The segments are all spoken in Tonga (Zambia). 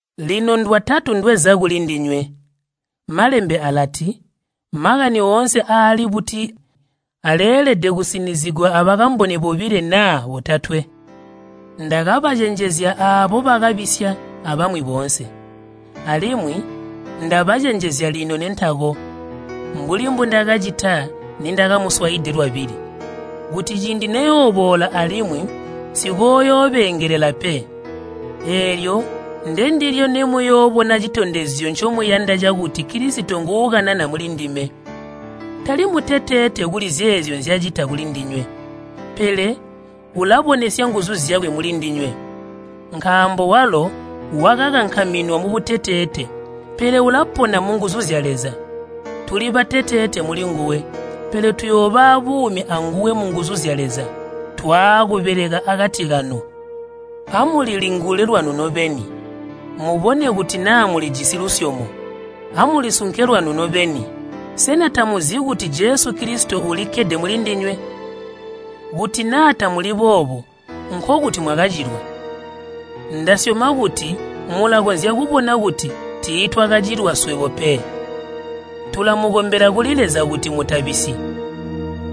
Lino ndwatatu ndweza kulindinywe. Malembe alati, “Makani oonse aali buti aleelede kusinizigwa abakamboni bobilo naa botatwe.” Ndakabacenjezya aabo bakabisya abamwi boonse, alimwi ndabacenjezya lino nentako, mbuli mbundakacita nindakamuswaide lwabili, kuti ciindi neyooboola alimwi nsikooyoobeengelela pe. Eelyo ndendilyo nemuyoobona citondezyo ncomuyanda cakuti Kilisito nguukanana mulindime. Tali muteteete kuli zeezyo nzyacita kulindinywe, pele ulabonesya nguzu zyakwe mulindinywe. Nkaambo walo wakakankaminwa mubuteteete, pele ulapona munguzu zya Leza. Tuli bateteete mulinguwe, pele tuyooba aabuumi anguwe munguzu zya Leza, twaakubeleka akati kanu. Amulilingule lwanu nobeni, mubone kuti naa mulijisi lusyomo. Amulisunke lwanu nobeni. Sena tamuzi kuti Jesu Kilisito ulikkede mulindinywe? Kuti naa tamuli boobo nkokuti mwakacilwa! Ndasyoma kuti mulakonzya kubona kuti tiitwakacilwa swebo pe. Tulamukombela kuli Leza kuti mutabisyi.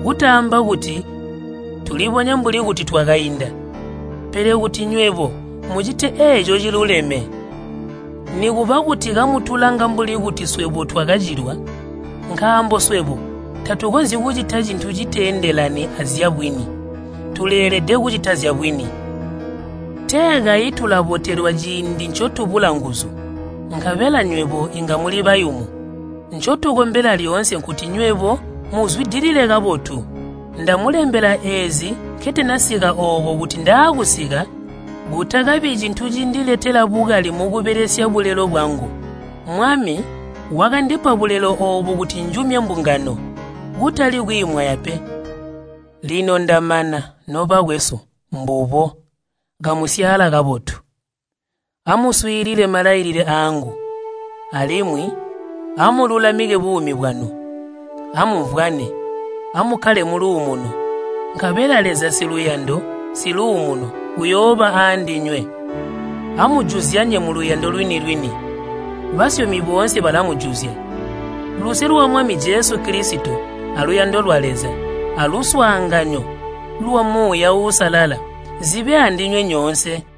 Kutaamba kuti tulibonye mbuli kuti twakainda, pele kuti nywebo mucite eeco ciluleme, nikuba kuti kamutulanga mbuli kuti swebo twakacilwa. Nkaambo swebo tatukonzyi kucita cintu citeendelani azyabwini, tuleelede kucita zyabwini. Tee kayi tulabotelwa ciindi ncotubula nguzu, nkabela nywebo inga muli bayumu. Ncotukombela lyoonse nkuti nywebo muzwidilile kabotu. Ndamulembela eezi nketanasika ooko kuti ndaakusika, kutakabi cintu cindiletela bukali mukubelesya bulelo bwangu. Mwami wakandipa bulelo oobu kuti njumye mbungano, kutali kwiimwaya pe. Lino ndamana, nobakwesu, mbubo, kamusyaala kabotu. Amuswiilile malailile aangu, alimwi amululamike buumi bwanu. Amumvwane, amukkale muluumuno, nkabela Leza siluyando, siluumuno uyooba aandinywe. Amujuzyanye muluyando lwini-lwini. Basyomi boonse balamujuzya. Luse lwa Mwami Jesu Kilisito aluyando lwa Leza, aluswaanganyo lwa Muuya Uusalala zibe aandinywe nyoonse.